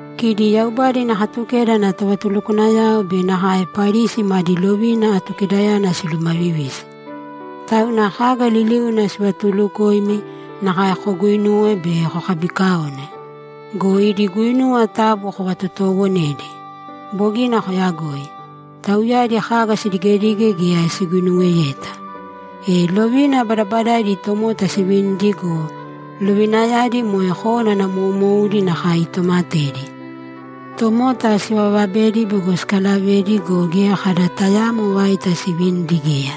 ‘Kidi Yaubada ina Katukeda ana tovatulukwanayao be nakae Parisi madi lovina Atukedayana silumavivisi. Tauna kaga liliuna sivatulukoimi, nakae koguuinūwe be kokabiikaōne go, idi guinuwa taabu kovatotoowonēdi. Bogina koyagoi. Tauyadi kaga sidigedige geya siguinuweyeta. E lovina badabadaidi tomota sivinidi go, lovinayadi moe kónana moumoudi nakae itomatedi. Tomota sivavabedi bego sikavaledi go, geya kada tayaamo vaita sivinidi geya.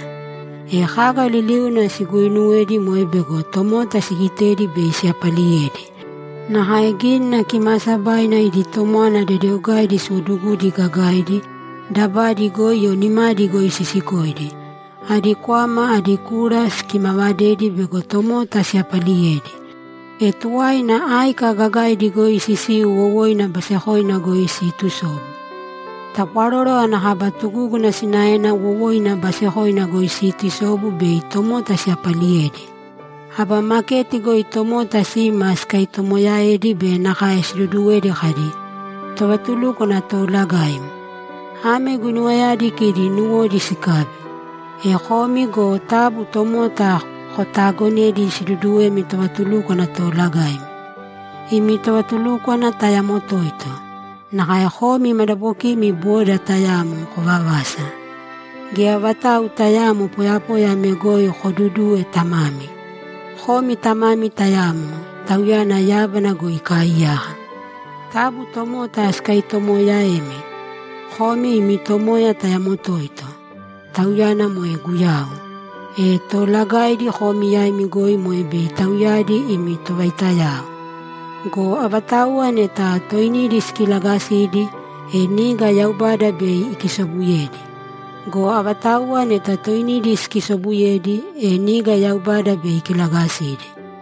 E kaga liliuna siguuinuwedi moe bego tomota sigitedi bei siyapaliyedi. Nakae Gínina Kimaasabaina idi tomwana dedeogaidi siwodugudi gagaidi, dabadi goi o nimadi goi sisikoidi. Adi kwama adi kura sikimanavedi bego tomota siyapaliyedi. E tuwaina áika gagaidi goi sisiu wowoina basekoina goi siitusobu. Tapwaroro ana kaba tugúguna sinaena wowoina basekoina goi siitusobu bei tomota siyapaliyedi. Aba maketi goi tomota sima sikatoomoyaedi be nakae siduduwedi kadi, “Tovatulúkwana Toolagaim.” Ame guinuwayadi kidi nuwodi sikabi. E komi go taabu tomota kotaagonēdi siduduwemi tovatulúkwana toolagaimi. Imi tovatulúkwana tayamo toito. Nakae komi madabokimi boda tayamo, kovavasa. Geya vatau tayaamo poyapoya ame goi kodudūwe tamami. Komi Tamami tayamo; Tauyana yábana goi ikaaiyaka. Taabu tomota sikatoomoyaēmi. Komi imi Tomoya tayamo toito; Tauyana moe Guyau. E toolagaidi komi yaimi goi moe bei tauyadi imi tovaitayao. Go avatauwa neta toinidi sikilagalagasidi, e niga Yaubada bei ikisobuyedi. Go avatauwa neta toinidi sikisobusobuyedi, e niga Yaubada bei ikilagasidi.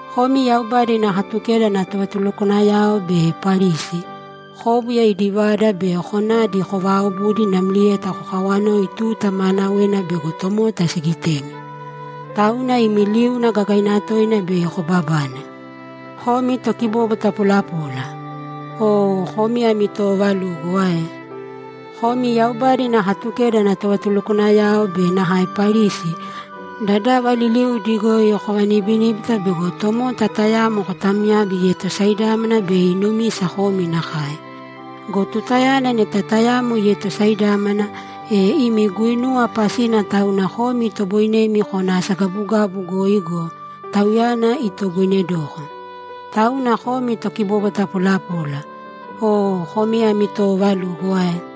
Komi Yaubada ina Katukeda ana tovatulukwanayao be Parisi, kóbuya idi vada be konadi kovaaobudi namlieta kokawanoi tuta maanawena bego tomota sigitemi. Tauna imi liuna gagaina toina bei kobabane. Komi tokibobwata polapola! Oo komi ami toovalugo ae?] Komi Yaubada ina Katukeda ana tovatulukwanayao be nakae Parisi, dadava liliudi goi kovanibiníbita bego tomota tayamo kotamyabi ietosaidámana bei inumisa komi nakae. Go tutayana neta tayamo ietosaidámana, e imi guinuwa pasina tauna komi itoboinemi kona asagabugabu goi go, tauyana itoboinedoko. Tauna komi tokibobwata polapola. Oo komi ami toovalugo ae?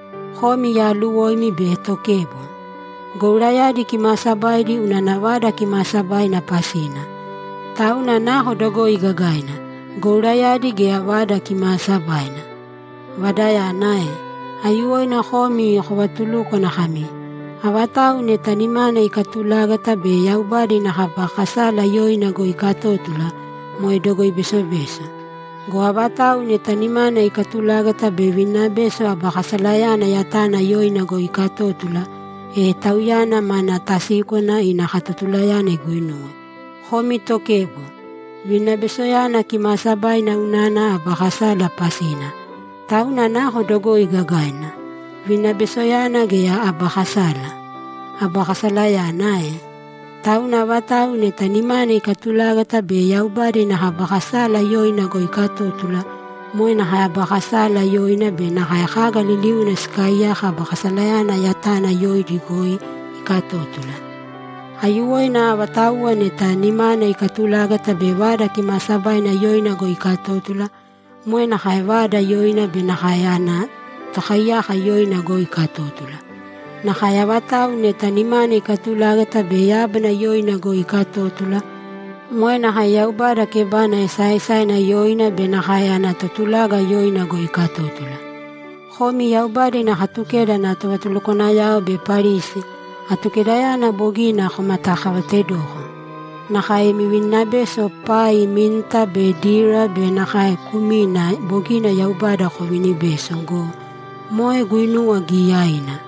Komi yaaluwoimi be tokebo! Gourayadi kimaasabaidi unana Vada Kimaasabaina pasina. Tauna nako dogoi gagaina, gourayadi gea Vada Kimaasabaina? Vadayana ae? Aiyuwoina komi kovatulúkwana kami, “Avatau neta nimana ikatulágata be Yaubada ina kaba kasala yoina goi ikatótula, moe dogoi besobeso. Go avatau neta nimana ikatulágata be vininabeso aba kasalayana yatana yoina goi ikatótula, e tauyana mana tasíkwana ina katotulayana iguinuwe.” Komi tokebo! Vininabesoyana kimaasabaina unana aba kasala pasina. Tauna nako dogoi gagaina, vininabesoyana gea aba kasala? Aba kasalayana ae? Tauna avatau neta nimana ikatulágata be Yaubada ina kaba kasala yoina goi ikatótula, moe nakae aba kasala yoina be nakae kaga liliuna sikaaiyaka aba kasalayana yatana yoidi goi ikatótula. Aiyuwoina avatau neta nimana ikatulágata be Vada Kimaasabaina yoina goi ikatótula, moe nakae Vada yoina be nakae ana Tokaiyaka yoina goi ikatótula. Nakae avatau neta nimana ikatulágata be yábana yoina goi ikatótula, moe nakae Yaubada kebana esaaesaina yoina be nakae ana Totulaga yoina goi ikatótula. Komi Yaubada ina Katukeda ana tovatulukwanayao be Parisi, Atukedayana bogina komatakavaatedoko. Nakae imi vininabeso pai, minta be dira be nakae kumina bogina Yaubada koviinibeso go, moe guinuwa giyaiina.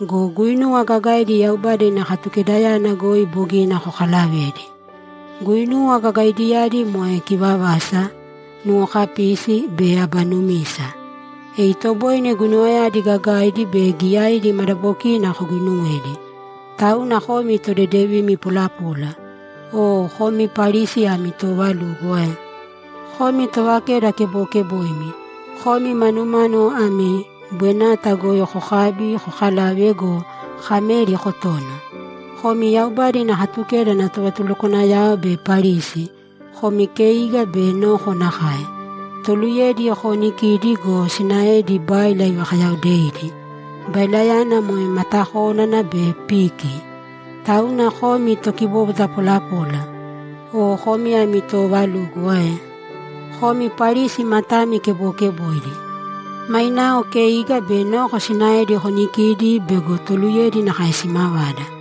Go guinuwa gagaidi Yaubada ina Katukedayana goi bogina kokalavedi. Guinuwa gagaidiyadi moe kivavasa, nuwokapisi be aba numisa. E itoboine guinuwayadi gagaidi be giyaidi madabokina koguinuwedi. Tauna komi todedevimi polapola! Oo komi Parisi ami toovalugo ae? Komi tovakeda kebokeboimi. Komi manumánuwo ami bwenata goi kokabi, kokalave go, kameri kotono. Komi Yaubada ina Katukeda ana tovatulukwanayao be Parisi, komi keiga be noko nakae. Toluyedi koonikidi go, sinaedi, báila ivakayaodeidi, bailayana moe matakónana be piki. Tauna komi tokibobwata polapola! Oo komi ami toovalugo ae? Komi Parisi matami kebokeboidi. Mainao keiga be noko sinaedi konikīdi bego toluyedi nakae simavada.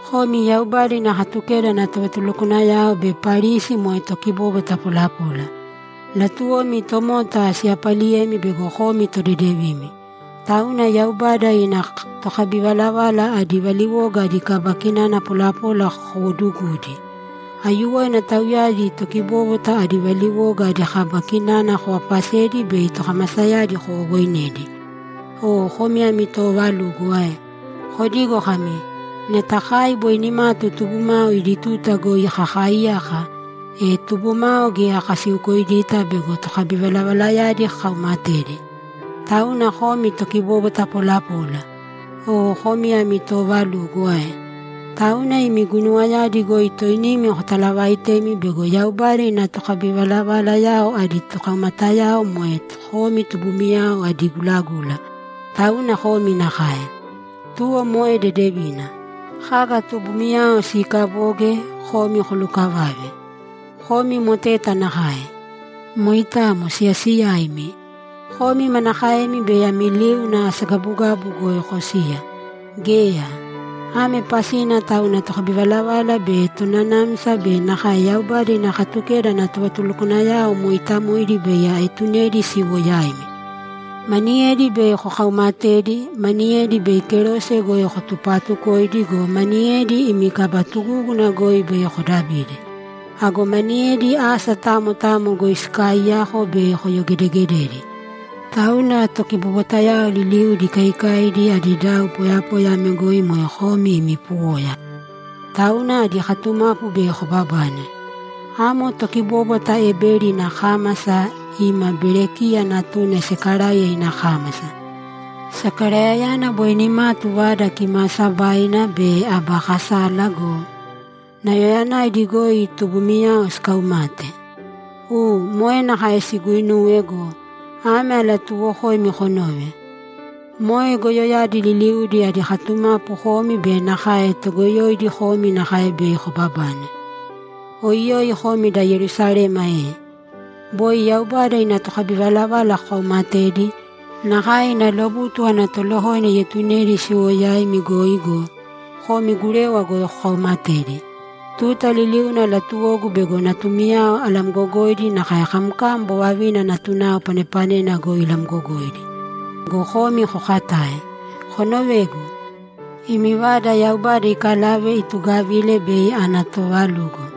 Komi Yaubada ina Katukeda ana tovatulukwanayao be Parisi moe tokibobwata polapola! Latuwomi tomota siyapaliyemi bego komi todedevimi, tauna Yaubada ina tokabivalavala adi valiwoga adi kaba kinana polapola kowoodugudi. Aiyuwoina tauyadi tokibóbwata adi valiwoga adi kaba kinana kovaapasedi bei tokamasayadi kowowoinedi. Oo komi ami toovalugo ae? Kodigo kami, “Neta kai boi nimatu tubumao idi tuta goi kakaaiyaka, e tubumao geya kasiukoidita bego tokabivalavalayadi kakaumatedi.” Tauna komi tokibobwata polapola! Oo komi ami toovalugo ae? Tauna imi guinuwayadi goi toinimi kotalavaitemi bego Yaubada ina tokabivalavalayao adi tokaumatayao moe komi tubumiyao adi gulagula, tauna komi nakae. Tuwo moe dedevina. Kaga tubumiyao siikaboge, komi kolukavāve! Komi moteta nakae! Moitamo siyasiyaimi! Komi manakaemi bei ami liuna asagabugabu goi kosiya? Geya! Ame pasina tauna tokabivalavala be tonanamsa be nakae Yaubada ina Katukeda ana tovatulukwanayao mooitamoidi bei aetunedi siwo yaimi. Maniyedi bei kokaumatedi, maniyedi bei kerose goi kotupatukoidi go, maniyedi imi kaba tugúguna goi bei kodabidi. Ago maniyedi asa tamo tamo goi sikaaiyako bei koyogedegededi. Tauna tokibobwatayao liliudi ikaikaidi adi dau poyapoya ame goi moe komi imi puwoya. Tauna adi katumapu bei kobabane. Amo tokibóbwata Ebeli ina kámasa ima Berekiya natuna Sakaraiya ina kámasa. Sakaraiyayana boi nimatu Vada Kimaasabaina be aba kasala go, nauyayanaidi goi tubumiyao sikaumate. U, moe nakae siguuinuwe go, ame alatuuwokoimi konōve: Moe goyoyadi liliudi adi katumapu komi be nakae toogoyoidi komi nakae bei kobabane. Oiyoi komi da Yerusalema e! Boi Yaubada ina tokabivalavala kokaumatedi, nakae ina lobutu ana tolokoina ietunedi siwo yaimi goi go, komi gurewa goi kokaumatedi. Tuta liliuna latuwogu bego natumiyao alamgogoidi nakae kamkam bovavina natunao panepanena goi ilamgogoidi go, komi kokatae. Konovēgu. Imi vada Yaubada ikalave itugavile bei ana toovalugo.